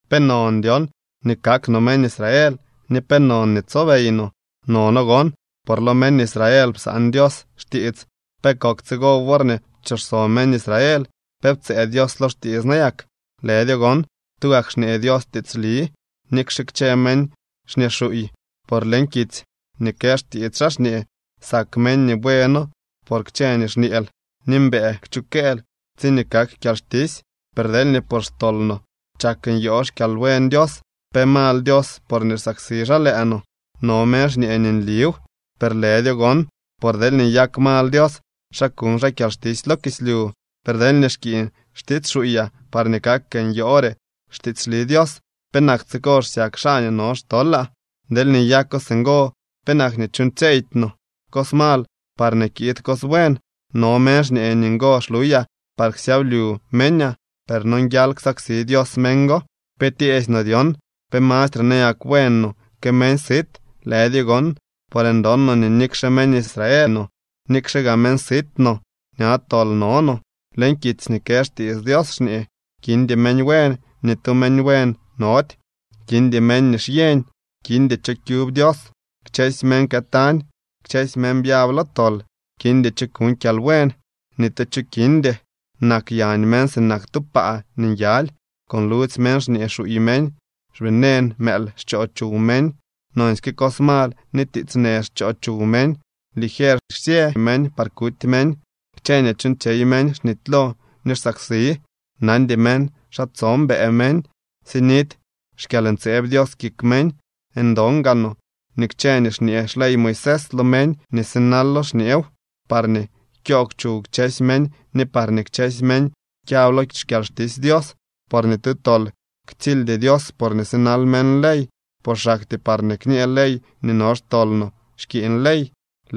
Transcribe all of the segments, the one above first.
¿Pe non dyon nii kak no meñ Israel, ni pe non nii tsobey no? Nono gon. Por lo meñ Israel psaan Dios xtiits. ¿Pe kok tsigo worñee pchooxso meñ Israel? ¿Pe ptsëë Dios lo xtiits nayak? ¡Lëdyo gon! Tugak xñee Dios tiitsli nikxe kchë meñ xñee xuuy, por leñ kitsy nii kë xtiits xaa xñee: Sak meñ nii bueenoo por kchë nii xñeel, ni mbëë kchukëël tsiñee kak kyalxtisy. Per deelñee por xtol no chak nyoo xkyalbuen Dios, ¿pe mal Dios porñee xsaksi xaa lëë no? No meñ xñee nii nliw. Per ¡lëdyo gon! Por deelñee nyak mal Dios, ¿xa kuñ xaa kyalxtisy lo kislyu? Per deelñee xkiiñ xtiits xuuyaa parñee kak nyoore xtiitsli Dios, ¿penak tsigo xsyak xaa nii no xtolaa? Deelñee nyako singo, ¿penak nii chuuñtsyeydy no cos mal parñee kiid cos buen? No meñ xñee nii ngo xluyaa par ksyablyu meñaa, per nonguial ksaksi Dios meñ go. ¿Pe tyeesy no dyon? ¿Pe mastre nayak buen no que meñ sit? ¡Lëdyo gon! Por ndon no nii nikxe meñ Israel no, nikxe gaa meñ sit no, ña tol no no. Leñ kitsy nii kë xtiits Dios xñee: Kindy meñ buen, ni tu meñ buen nody. Kindy meñ nii xyeñ, kindy cho kyub Dios. Kchësy meñ këtañ, kchësy meñ byab lo tol. Kindy cho kuñ kyalbuen, ni tu cho kindy. Nak yañ meñ sinak tu paa nii nyaly, con ludzy meñ xñee xuuy meñ, xvenen mëël xchoo chuw meñ. Nonsyke cos mal ni tiits në xchoo chuw meñ. Ligier xsyë meñ par kuty meñ, kchë nii chuuñtsyey meñ xnitylo ni xsaksi, nandy meñ xa tso mbëë meñ. Sinidy xkyalntseeb Dios kik meñ. Ndon gaa no nii kchë nii xñee xley Moisés, lo meñ nii sinalo xñeew, parñee kyoogw chuw kchësy meñ ni parñee kchësy meñ kyab lo xkyalxtisy Dios. Por ni tu tol ktsildy Dios porñee sinal meñ ley, por xaktyee parñee kñë ley nii no xtol no xkiiñ ley.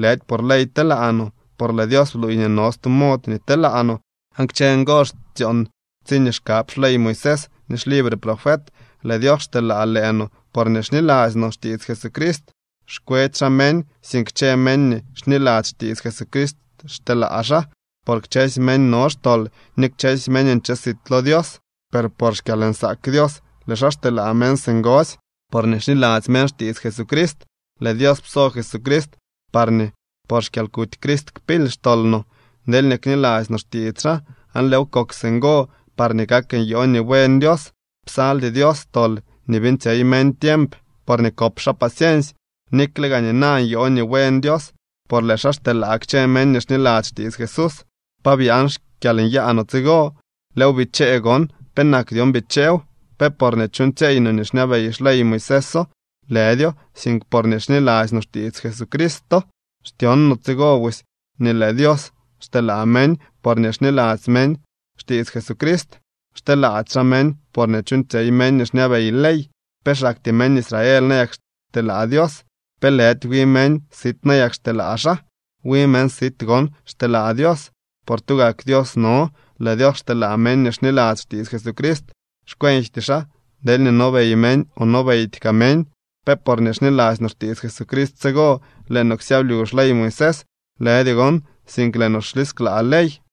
Lëdy por ley telaa no, por lëë Dios bluuy nii no stu mod nii telaa no, aan kchë ngo xtyoon tsiñee xkab xley Moisés ni xlibre profet. Lëë Dios xteelaa lëë no porñee xniladzy no xtiits Jesucrist. Xkwedy xaa meñ, sink kchë meñ nii xniladzy xtiits Jesucrist xteelaa xaa. Por kchësy meñ no xtol ni kchësy meñ nche sit lo Dios. Per por xkyalnsaak Dios lëë xaa xteelaa meñ singosy, porñee xniladzy meñ xtiits Jesucrist. Lëë Dios pso Crist parñee por xkyalkuty Crist kpily xtol no deelñee kniladzy no xtiits xaa. Aan lëëw kok singo parñee kak nyoo nii buen Dios. Psaldy Dios tol nii beeñtsyey meñ tiemp porñee kop xaa paciensy, nikle gaa nina nyoo nii buen Dios, por lëë xaa xteelaa kchë meñ nii xniladzy xtiits Jesús. ¿Pa byaan xkyalnyaa no tsigo? Lëëw bichee gon. ¿Penak dyon bicheew? ¿Pe porñee chuuñtsyeey no nii xñabey xley Moiséso? Lëdyo, sink porñee xniladzy no xtiits Jesucristo. Xtyon no tsigo busy nii lëë Dios xteelaa meñ porñee xniladzy meñ xtiits Jesucrist. Xteelaady xaa meñ porñee chuuñtsyey meñ nii xñabey ley. ¿Pe xaktyee meñ Israel nayak xteelaa Dios? ¿Pe lëdy wi meñ sit nayak xteelaa xaa? Wi meñ sit gon xteelaa Dios, por tugak Dios no. Lëë Dios xteelaa meñ nii xniladzy xtiits Jesucrist. Xkwenjty xaa deelñee nobey meñ o nobeydy kaa meñ. ¿Pe porñee xniladzy no xtiits Jesucrist tsigo, lëë no ksyablyu xley Moisés? ¡Lëdyo gon!, sink lëë no xlisklaa ley.